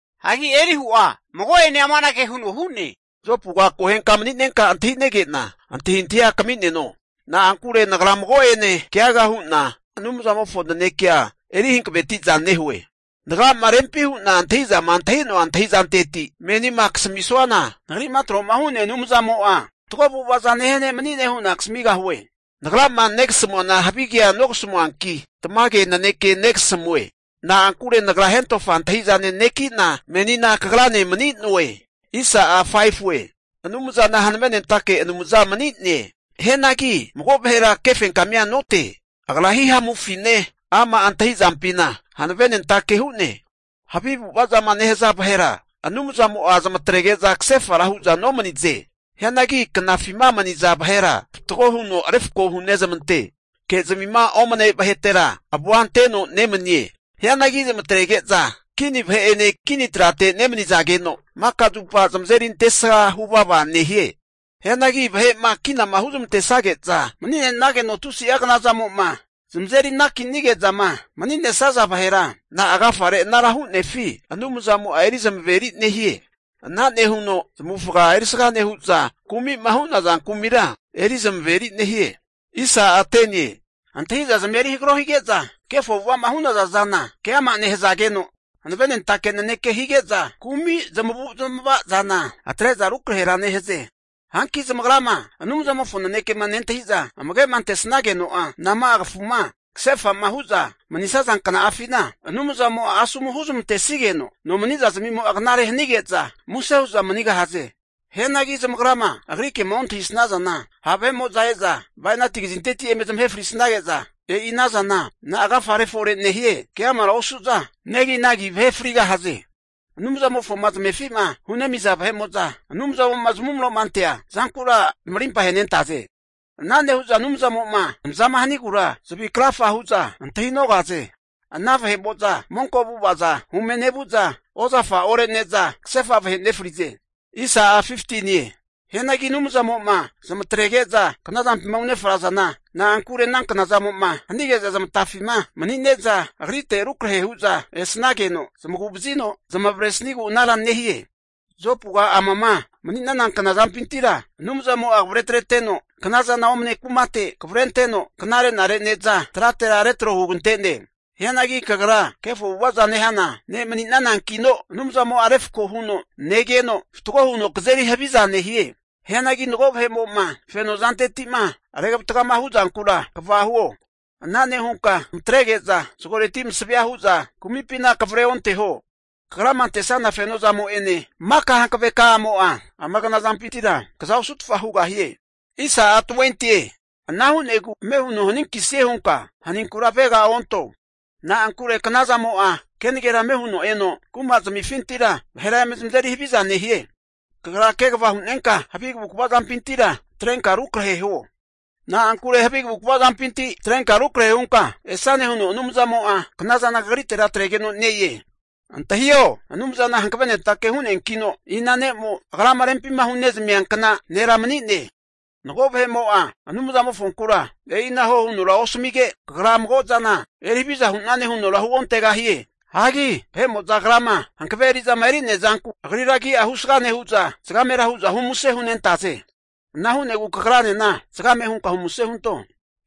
Hagi Elihu'a mago'ene amanage huno hu'ne. Jopuga akohenka mani'nenka antahi'nege'na antahintahia kami'neno. Na'ankure nagra mago'ene keaga hu'na Anumzamofo nanekea eri hankaveti'za nehue. Nagrama rempi hu'na antahi'zama antahi'noa antahi'zanteti menima kasamisuana, nagri'ma tro'ma hu'nea Anumzamo'a fatgo avu'ava'za nehia ne' mani'ne hu'na kasamigahue. Nagrama negasamuana havigea nogasamuanki, tamage naneke negasamue. Na'ankure nagra hentofa antahi'zane neki'na, menina kagrane mani'noe. Anumzana hankavenentake Anumza mani'ne. Hianagi mago vahera kefenkamia note. Agra hihamufine, ama' antahi'zampina hankavenentake hu'ne. Havi avu'ava'zama nehaza vahera Anumzamo'a zamatrege'za kasefara hu'za nomanize. Hianagi knafima mani'naza vahera fatgo huno refko hunezmante. Ke'zamima omne vahetera avua anteteno nemanie. Hianagi zamatrege'za kini vahe'ene kini trate nemanizageno, maka zupa zamazeri antesga huvava nehie. Hianagi vahe'ma kina huzmantesage'za mani'nenageno tusi'a knazamo'ma zamazeri anakinige'zama mani'nesaza vahera, na'a agafare anara hu'nefi Anumzamo'a eri zamaveri nehie. Ana nehuno zamavufaga erisga nehu'za kumi'ma hu'naza kumira eri zamaveri nehie. Antahi'zazmia eri hagaro hige'za kefo avu'ava'ma hu'naza zana keama nehazageno, hanavenentake naneke hige'za kumi zamavu'zmava zana atre'za rukrahera nehaze. Hanki zamagrama Anumzamofo nanekema nentahi'za, amage'ma antesnageno'a, nama'a kafuma kasefa'ma hu'za manisaza kna'afina Anumzamo'a asomu huzmantesigeno no mani'zazmimo'a knare hanige'za, muse hu'za manigahaze. Hianagi zamagrama Agri kema ontahisnazana, ha' vahe'mo'za e'za bainati kazinteti eme zamahe frisnage'za, e'i anazana na'a agafare fore nehie keamara osu'za neginagi vahe frigahaze. Anumzamofoma zamefi'ma hunemiza vahe'mo'za, Anumzamo'ma zamuvro'ma antea zankura zamarimpa ahenentaze. Ana nehu'za Anumzamo'ma zamazama hanigura zavi krafa hu'za antahi'nogaze. Ana monko avu'avaza hume nevu'za, ozafa orene'za kasefa vahe nefrize. Hianagi Anumzamo'ma zamatrege'za knazampima unefrazana, na'ankure ana knazamo'ma hanige'za zmatafima mani'ne'za Agrite rukrahe hu'za esnageno zamagu vazino zamavaresnigu anara nehie. Jopuga amama mani'nana knazampintira Anumzamo'a kavre atreteno, knaza omane kumate kavrenteno knare'nare ne'za tratera retro hugante'ne. Hianagi kagra kefo avu'ava'za nehana ne' mani'nanankino Anumzamo'a refko huno negeno, fatgo huno kazeri havizana nehie. Hianagi mago vahe'mo'ma feno zanteti'ma regvatagama hu'zankura kva huo. Ana nehunka zamatrege'za zagoreti masavea hu'za kumipina kavre onteho. Kagrama antesnana fenozamo'ene, maka hankaveka'amo'a ama knazampintira kaza osutfa hugahie. Ana hu'negu ame huno haninkisie hunka haninkura avega onto. Na'ankure knazamo'a kenagera ame huno eno, kumazamifintira vahera eme zamazeri haviza nehie. Kagra kegava hu'nenka havi kavukva zampintira atrenka rukrahe huo. Na'ankure havi kavukva zampinti atrenka rukrahe hunka esane huno Anumzamo'a knazana kagritera atregeno ne-e. Antahiho! Anumzana hankavenentake hu'neankino, ina ne'mo Agrama rempima hunezamiankna nera mani'ne? Mago vahe'mo'a Anumzamofonkura, e'ina huo hunora osamige, Kagra mago zana eri haviza hu'nane hunora huontegahie. Hagi Agrama hankave eri'zama eri'nea zanku Agrira agi'a husga nehu'za, zagamera hu'za humuse huntegahaze. Ana hu'negu kagranena zagame hunka humuse hunto.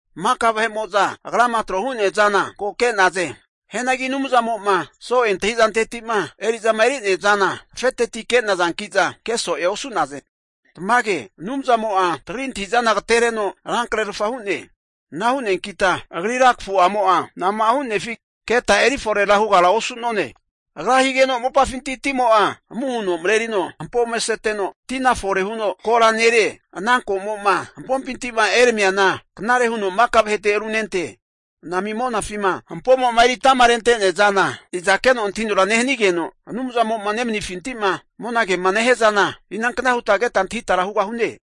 Maka vahe'mo'za Agrama tro hu'nea zana, ko ke'naze. Hianagi Anumzamo'ma so'e antahi'zanteti'ma eri'zama eri'nea zana afeteti ke'nazanki'za, keso'ea osu'naze. Tamage, Anumzamo'a tagri antahi'zana agatereno rankrerfa hu'ne. Ana hu'neankita Agrira kafu'amo'a nama'a hu'nefi keta eri forera hugara osu'none. Agra higeno mopafinti timo'a amu huno marerino, hampo ome seteno tina fore huno kora nerie. Ana ko'mo'ma hampompinti'ma eramiana knare huno maka vahete runente. Anami monafima hampoma eritama rente'nea zana, iza keno antahinora nehanigeno, Anumzamo'ma nemanifinti'ma monagema nehia zana, inankna huta keta antahitara hugahune?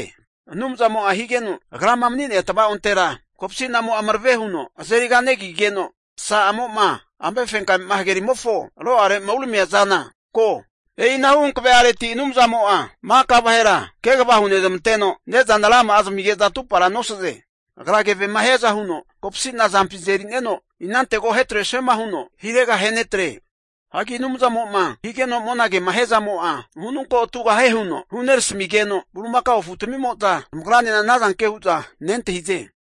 Anumzamo'a higeno Agrama mani'nea tavaontera kopsi'namo'a marave huno azeri kanegigeno, masa'amo'ma amefenkame'ma hagerimofo ro'are'ma uneramia zana ko. E'inahu hankave'areti Anumzamo'a maka vahera kegava hunezmanteno, ne'zana rama'a zamige'za atupara nosaze. Agra kevema hiaza huno kopasi'na azampi eri'neno, inantego ahetresuema huno hirega ahenetre. Hagi Anumzamo'ma higeno monagema hiazamo'a, ununko atugahie huno hunerasamigeno, bulimakao afutamimo'za zamagranena anazanke hu'za nentahize.